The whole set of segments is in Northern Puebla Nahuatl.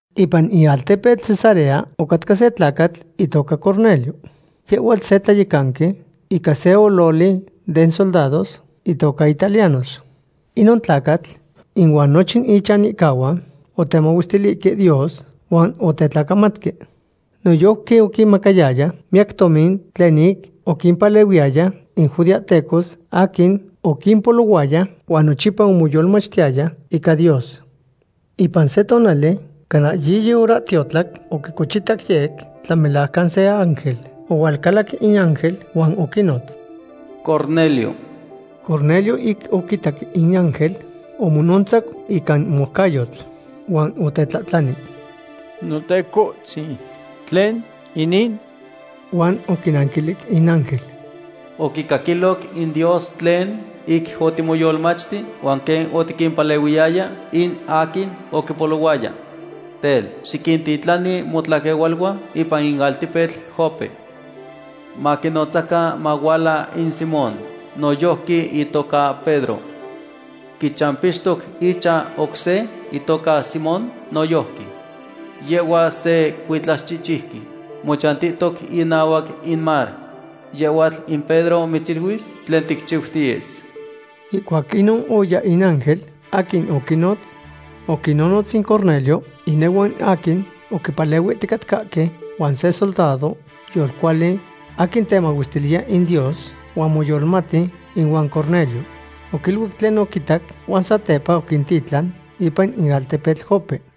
Ipan in altepetl Cesarea ocatca se tlacatl itoca Cornelio. Yehhuatl se tlayecanqui ica se ololi den soldados itoca Italianos. Inon tlacatl ihuan nochin ichanihcahuan otemahuestilihque Dios huan otetlacamatque. Noyojqui oquimacayaya miyac tomin tlen ic oquimpalehuiyaya in judeahtecos aquin oquimpolohuayaya huan nochipa omoyolmachtiyaya ica Dios. Ipan se tonali, cana yiyi horahtiotlac, oquicochitac yec tlamelajcan se ángel. Ohualcalac in ángel huan oquinotz: ―¡Cornelio! Cornelio ic oquitac in ángel omonontzacu ica moucayotl. Huan otetlahtlani: ―¿Notecohtzin, tlen inin? Huan oquinanquilic in ángel: ―Oquicaquiloc in Dios tlen ic otimoyolmachti huan quen otiquimpalehuiyaya in aquin oquipolohuaya. Tel, xiquintitlani motlaquehualuan ipan in altepetl Jope. Maquinotzacan mahuala in Simón, noyojqui itoca Pedro. Quichampixtoc ichan oc se itoca Simón noyojqui. Yehhuatl se cuitlaxchihchiuqui mochantihtoc inahuac in mar. Yehhuatl in Pedro mitziluis tlen ticchiutiyes. Ihcuac inon oya in ángel aquin oquinotz. Oquinnotz in Cornelio inehuan aquin oquipalehuihticatcahque huan se soldado yolcuali aquin temahuestiliya in Dios huan moyolohmati ihuan Cornelio. Oquiniluic tlen oquitac huan satepa oquintitlan ipan in altepetl Jope.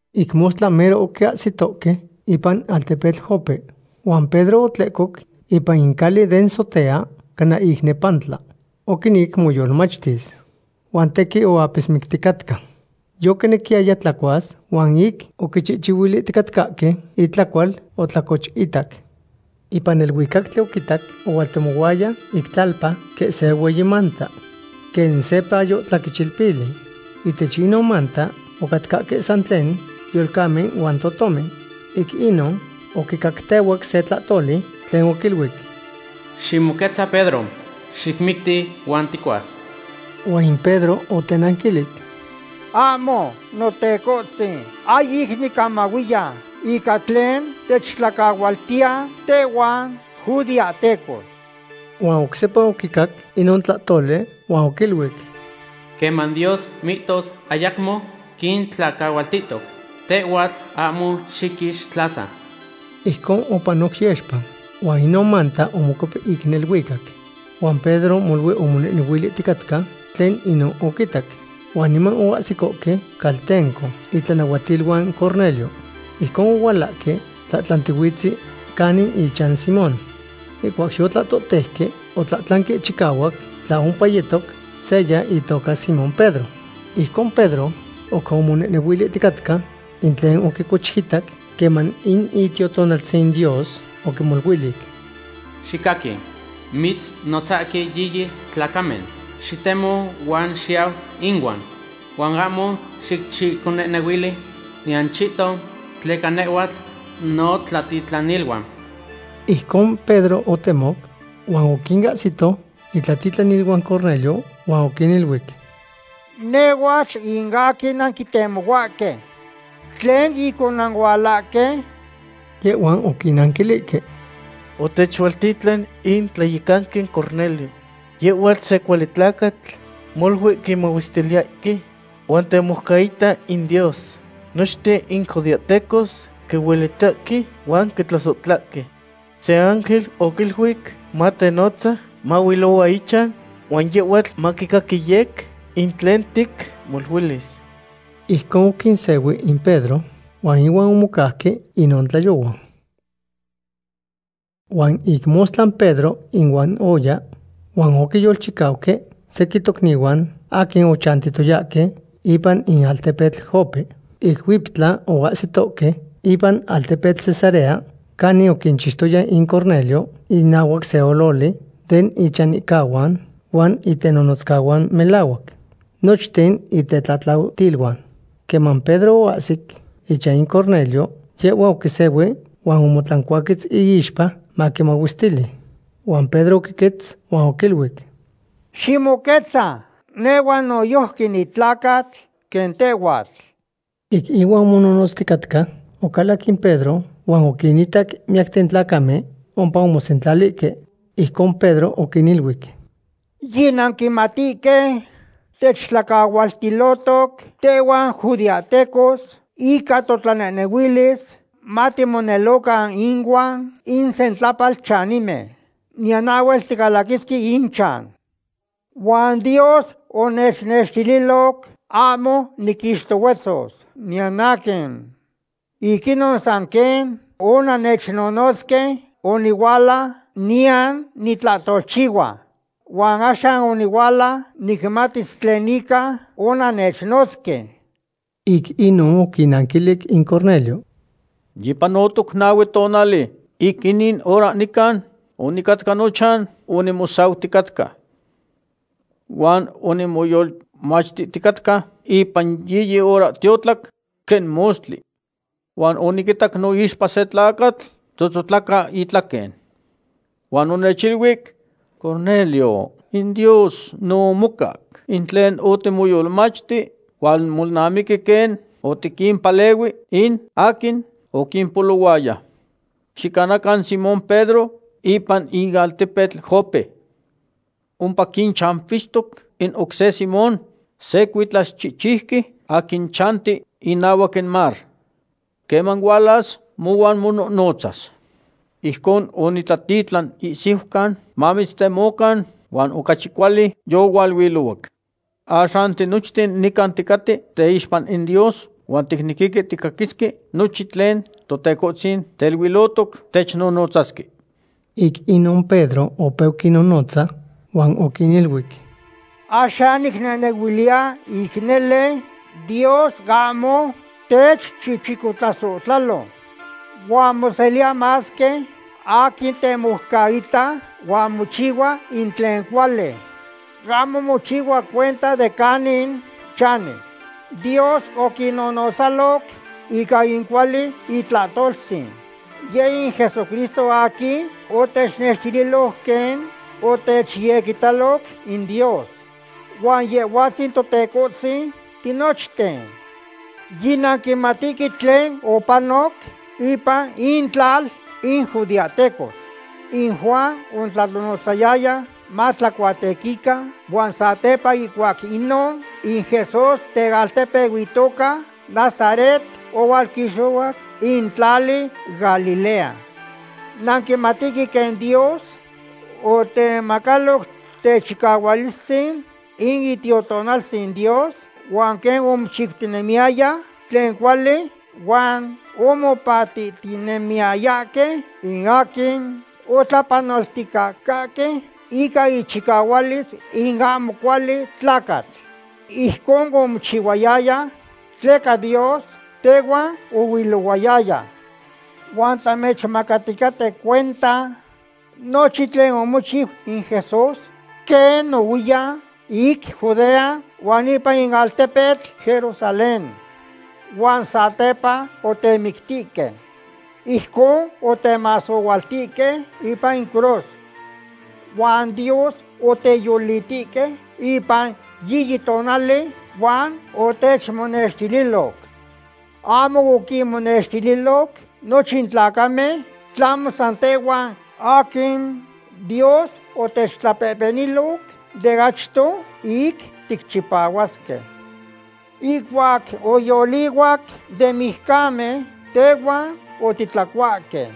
Ic mostla mero oquiahsitohque ipan altepetl Jope. Huan Pedro otlehcoc ipan in cali den sotea cana ic nepantla. Oquinec moyolmachtis. Huan tequin oapismicticatca. Yoquinequiyaya tlacuas huan ic oquichihchihuilihticatcahque itlacual, otlacochitac. Ipan neluicactli oquitac ohualtemohuaya ic tlalpa quen se hueyi manta. Quen se payo tlaquechilpili. Ihtech inon manta ocatcahque san tlen yolcamen huan totomen. Ic inon oquicactehuac se tlahtoli tlen oquiluic: ―Ximoquetza Pedro. Xicmicti huan ticuas. Huan in Pedro otenanquilic: ―Ahmo, Notecohtzin, ahyic nicamahuiya ica tlen techtlacahualtiya tehhuan judeahtecos. Huan oc sepa oquicac inon tlahtoli huan oquiluic: ―Queman Dios mihtos ayacmo quintlacahualtihtoc, tehhuatl ahmo xiquixtlasa. Ijcon opanoc yexpa, huan inon manta omocuep ic neluicac. Huan Pedro molui omonehnehuilihticatca tlen inon oquitac. Huan niman oahsicohque caltenco itlanahuatiluan Cornelio. Ijcon ohualahque tlahtlantihuitzen canin ichan Simón. Ihcuac yotlahtoteuque, otlahtlanque chicahuac in tla ompa yetoc seya itoca Simón Pedro. Ijcon Pedro oc monehnehuilihtica in tlen oquicochitac queman in Itiotonaltzin Dios oquimoluilic: ―Xicaqui, mitznotzahque yiyi tlacamen. Xitemo huan xiyau inuan. Huan ahmo xicchiconehnehuili niyan chihton tleca nehhuatl notlatitlaniluan. Ijcon Pedro otemoc huan oquinahsito itlatitlaniluan Cornelio huan oquiniluic: ―Nehhuatl in aquin nanquitemohuahque. ¿Tlen ic onanualahque? Yehhuan oquinanquilihque: ―Otechualtitlan in tlayecanqui Cornelio. Yehuatl se cuali tlacatl molui quimahuestiliyahque huan temoucaita in Dios. Nochten in judeahtecos quihuelitahque huan quitlasohtlahque. Se ángel oquiluic matenotza mahuilohua ichan, huan yehhuatl maquicaqui yec in tlen ticmoluilis. Ijcon oquinsehui in Pedro, huan ihuan omocauque inon tlayohua. Huan ic mostla Pedro inuan oya, huan oquiyolchicauque sequin tocnihuan aquin ochantiyayahque ipan in altepetl Jope. Ic huiptla oahsitohque ipan altepetl Cesarea canin oquinchixtoya in Cornelio inahuac se ololi den ichanihcahuan huan itenonotzcahuan melahuac. Nochten itetlatlautiluan. Queman Pedro oahsic ichan in Cornelio, yehhua oquisehui huan omotlancuaquetz iixpa maquimahuestili. Huan Pedro oquiquetz huan oquiluic: ―¡Ximoquetza! Nehhuatl noyojqui nitlacatl quen tehhuatl. Ic ihuan omonohnotzticatca, ocalac in Pedro huan oquinitac miyacten tlacamen ompa omosentlalihque. Ijcon Pedro oquiniluic: ―Yinanquimatihque techtlacahualtilohtoc tehhuan judeahtecos ica totlanehnehuilis matimonelocan inuan in sentlapalchanimen. Niyan ahhuel ticalaquisque inchan. Huan Dios onechnextililoc ahmo niquixtohuetzos niyan aquin. Ic inon san quen onannechnotzque onihuala, niyan nitlahtolchihua. Huan axan onihuala nicmatis tlen ica onannechnotzque. Ic inon oquinanquilic in Cornelio: ―Yipanotoc nahue tonali ic inin hora nican onicatca nochan onimosauticatca. Huan onimoyolmachticatca ipan yiyi horahtiotlac, quen mostli. Huan oniquitac noixpa se tlacatl tzotzotlaca itlaquen. Huan onechiluic: “Cornelio, in Dios no omocac in tlen otimoyolmachti, huan molnamiqui quen otiquimpalehui in aquin oquimpolohuaya. Xicanacan Simón Pedro ipan in altepetl Jope. Ompa quichampixtoc in oc se Simón, se cuitlaxchihchiuqui aquin chanti inahuac in mar. Queman hualas, mohuan monohnotzas.” Ijcon onitlatitlan ihsiucan mamitztemocan, huan ocachi cuali yohualuilohuac. Axan tinochten nican ticaten teixpa in Dios huan ticnequihque ticaquisque nochin tlen Totecohtzin teiluilohtoc technonotzasque. Ic inon Pedro opeu quinnonotza huan oquiniluic: ―Axan nicnehnehuiliya ic nele Dios ahmo techchichicotlasohtlalo. Huan moseliya masque aquin temoucaita huan mochihua in tlen cuali. Ahmo mochihua cuenta de canin chani. Dios oquinnonotzaloc ica in cuali itlahtoltzin. Yeh in Jesucristo aquin otechnextililoc quen otechyequitaloc in Dios. Huan Yehhuatzin Totecohtzin tinochten. Yinanquimatihque tlen opanoc ipan intlal in judeahtecos. In Juan otlanonotzayaya matlacuatequican huan satepa ihcuac inon, in Jesús tealtepeu itoca Nazaret ohualquixohuac in tlali Galilea. Nanquimatihque quen Dios otemacaloc techicahualistzin in Itiotonaltzin Dios huan quen omochiutinemiyaya tlen cuali huan omopahtihtinemiyayahque in aquin otlapanolticatcahque ica ichicahualis in ahmo cuali tlacatl. Ijcon omochihuayaya tleca Dios tehuan ohuilohuayaya. Huan tamechmacaticaten cuenta nochin tlen omochiu in Jesús quen nohuiyan ic Judea huan ipan in altepetl Jerusalén. Huan satepa otemictihque. Ijcon otemasohualtihque ipan in cruz. Huan Dios oteyolitihque ipan yiyi tonali huan otechmonextililoc. Ahmo oquinmonextililoc nochin tlacamen, tlahmo san tehhuan aquin Dios otechtlapehpeniloc de achto ic ticchipahuasque. Ihcuac oyolihuac den mijcamen tehuan otitlacuahque.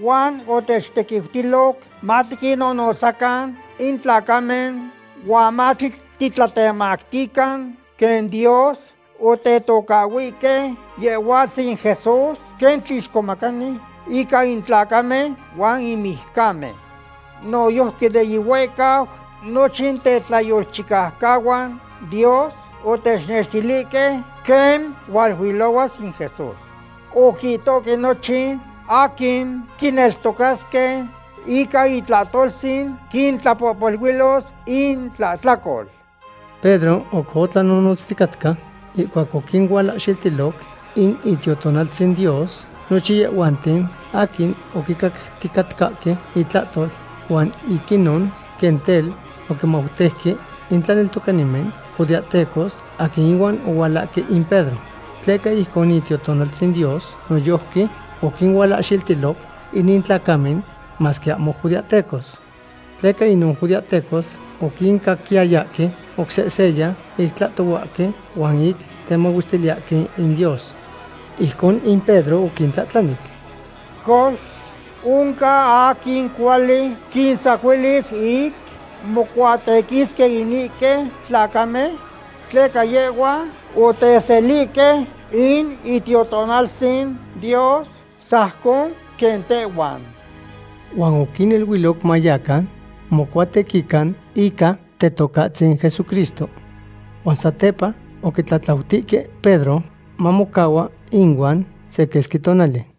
Huan otechtequiutiloc matiquinnonotzcacan in tlacamen huan matitlatemactican quen Dios otetocahhuihque Yehhuatzin Jesús quen Tlixcomacani ica in tlacamen huan in mijcamen. Noyojqui de yihuehcau nochin tetlayolchicaucahuan Dios otechnextilihque quen hualuilohuas in Jesús. Oquihtohque nochin aquin quineltocasque ica itlahtoltzin quintlapohpoluilos intlahtlacol. Pedro oc tlanonotztica ihcuac oquinualahxiltiloc in Itiotonaltzin Dios nochin yehhuanten aquin oquicacticatcahque itlahtol. Huan ic inon quen tel oquimautejque in tlaneltocanimen judeahtecos aquin ihuan ohualahque in Pedro. Tleca ijcon in Itiotonaltzin Dios noyojqui oquinualahxiltiloc inin tlacamen, masque ahmo judeahtecos. Tleca inon judeahtecos oquincaquiyayahque oc seseya ic tlahtohuahque huan ic temahuestiliyahque in Dios. Ijcon in Pedro oquintlahtlani: ―Cox, ¿oncan aquin cuali quintzacuilis ic mocuatequisque inihque tlacamen? Tleca yehhuan oteselihque in Itiotonaltzin Dios sajcon quen tehhuan. Huan oquiniluic mayacan mocuatequican ica Tetocahtzin Jesucristo. Huan satepa oquitlatlautihque Pedro mamocahua inuan se quesqui tonali.